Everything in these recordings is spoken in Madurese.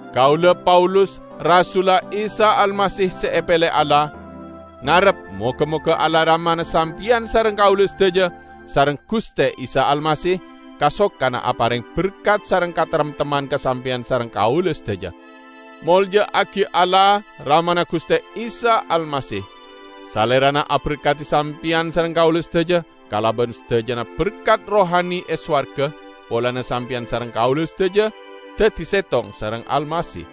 Kaula, Paulus, rasulla Isa Almasih se epele Allah, ngarep moga-moga Allah Ramana sampeyan sareng kaula sadaja sareng Guste Isa Almasih kasokana apareng berkat sareng kataremtemman ka sampeyan sareng kaula sadaja! Molja'agi Allah, Ramana Guste Isa Almasih! Salerana aberkadi sampeyan sareng kaula sadaja kalaban sadajana berkat rohani e sowarga, polana sampeyan sareng kaula sadaja daddi settong sareng Almasih.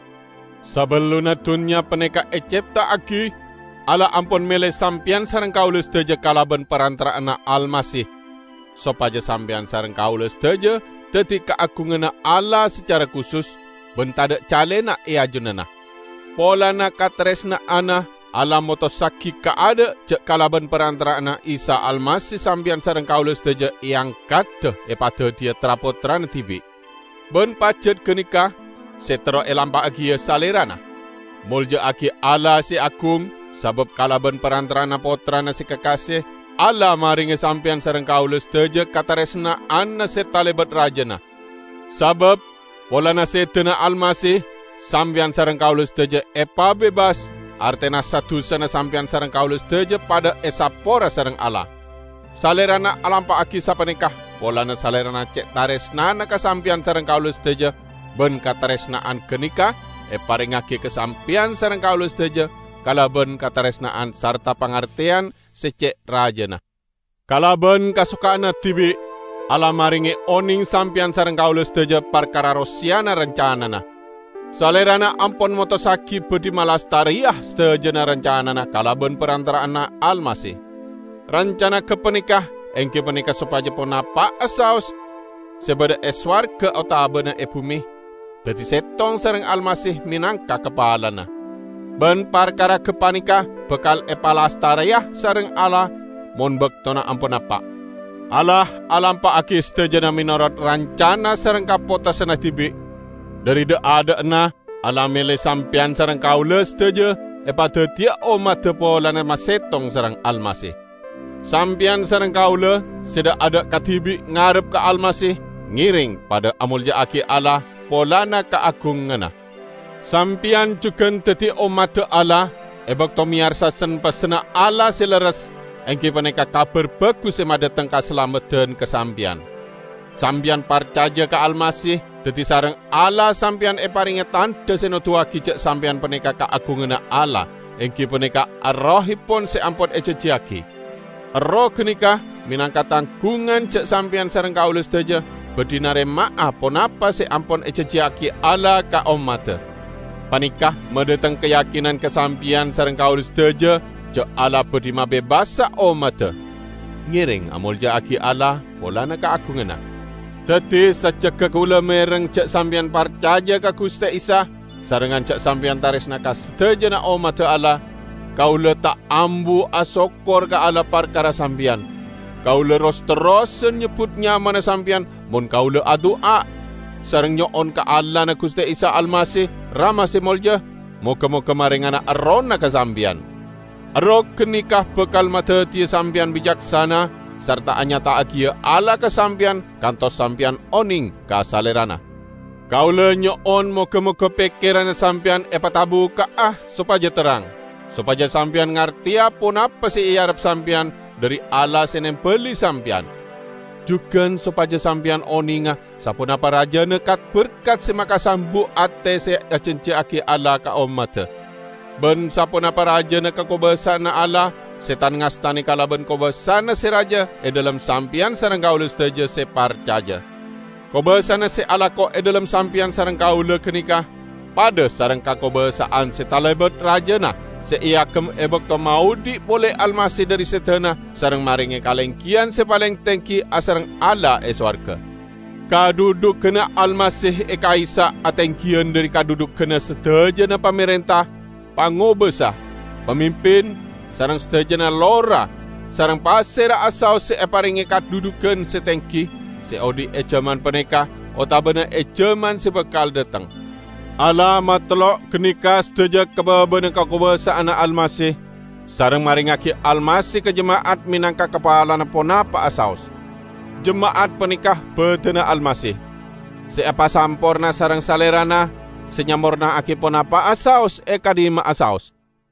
Sabellunna dunnya paneka ecepta'agi, Allah ampon mele sampeyan sareng kaula sadaja kalaban parantara'anna Almasih, sopaja sampeyan sareng kaula sadaja daddi kaagunganna Allah sacara kusus, ban tadha' calena e ajunanna. Polana kataresna'anna, Allah motossagi kaadha', ja' kalaban parantara'anna Isa Almasih sampeyan sareng kaula sadaja eangkada epadaddiya tra-pottrana dibi'. Ban pajat ganeka se terro elampa'agiya Salerana. Molja'agi Allah se agung, sabab kalaban parantara'anna Pottrana se kakase Allah marenge sampeyan sareng kaula sadaja kataresna'anna se talebat rajana. Sabab, polana sedana Almasih, sampeyan sareng kaula sadaja epabebas, artena sa-dusana sampeyan sareng kaula sadaja padha esapora sareng Allah. Salerana alampa'agi sapaneka polana Salerana ce' taresnana ka sampeyan sareng kaula sadaja, ban kataresna'an ganeka eparengngagi ka sampeyan sareng kaula sadaja kalaban kataresna'an sarta pangarteyan se ce' rajana. Kalaban kasokanna dibi', Allah marenge oneng sampeyan sareng kaula sadaja parkara roseyana rancanana; Salerana ampon motossagi badhi malastareya sadajana rancanana kalaban parantara'anna Almasih. Rancana gapaneka enggi paneka sopaja ponapa'a saos, se badha e sowarga otabana e bume, daddi settong sareng Almasih menangka kapalana. Ban parkara gapaneka bakal epalastareya sareng Allah mon baktona ampon napa'. Allah alampa'agi sadajana menorot rancana sareng kapotosanna dibi'. Dhari dha'-adha'na Allah mele sampeyan sareng kaula sadaja epadaddiya ommadda polana masettong sareng Almasih. Sampeyan sareng kaula, se dha'-adha' kadibi' ngarep ka Almasih, ngereng padha amolja'agi Allah polana kaagunganna. Sampeyan jugan daddi ommadda Allah e bakto meyarsa sen-pessenna Allah se lerres, enggi paneka Kabar Bagus se madhateng kasalameddan ka sampeyan. Sampeyan parcaja ka Almasih, daddi sareng Allah sampeyan eparenge tandha se noduwagi ja' sampeyan paneka kaagunganna Allah, enggi paneka Errohepon se ampon ejanjiyagi. Erroh ganeka menangka tanggungan ja' sampeyan sareng kaula sadaja badhi narema'a ponapa se ampon ejanjiyagi Allah ka ommadda. Paneka madhateng kayakinan ka sampeyan sareng kaula sadaja ja' Allah badhi mabebasa ommadda. Ngereng amolja'agi Allah polana kaagunganna. Daddi, sajjegga kaula mereng ja' sampeyan parcaja ka Guste Isa, sarengngan ja' sampeyan taresna ka sadajana ommadda Allah, kaula ta' ambu asokkor ka Allah parkara sampeyan. Kaula ros-terrosan nyebbut nyamana sampeyan mon kaula adu'a, sareng nyo'on ka Allahna Guste Isa Almasih, Rama se molja, moga-moga marengana Errohna ka sampeyan. Erroh ganeka bakal madaddiya sampeyan bicaksana sarta anyata'agiya Allah ka sampeyan kantos sampeyan oneng ka Salerana. Kaula nyo'on moga-moga pekkeranna sampeyan epatabukka'a sopaja terrang sopaja sampeyan ngarteya ponapa se earep sampeyan dhari Allah se nembali sampeyan. Jugan sopaja sampeyan onenga saponapa rajana kat-berkat se makasambu' ate se ejanjiyagi Allah ka ommadda; ban saponapa rajana kakobasa'anna Allah se tan-ngastane kalaban kobasana se raja e dhalem sampeyan sareng kaula sadaja se parcaja. Kobasana se alako e dhalem sampeyan sareng kaula ganeka padha sareng kakobasa'an se talebat rajana se eagem e bakto maodhi' pole Almasih dhari sedana sareng marenge kalenggiyan se paleng tenggi asareng Allah e sowarga. Kadhudhuganna Almasih e ka'issa' atenggiyan dhari kadhudhuganna sadajana pamarenta, pangobasa, pamimpin, sareng sadajana lora, sareng pasera'a saos se eparenge kadhudhugan se tenggi, se odhi' e jaman paneka otabana e jaman se bakal dhateng. Allah matellok ganeka sadaja ka babana kakobasa'anna Almasih, sareng marengngagi Almasih ka jema'at menangka kapalana ponapa'a saos. Jema'at paneka badanna Almasih, se epasamporna sareng Salerana se nyamporna'agi ponapa'a saos e ka'dhimma'a saos.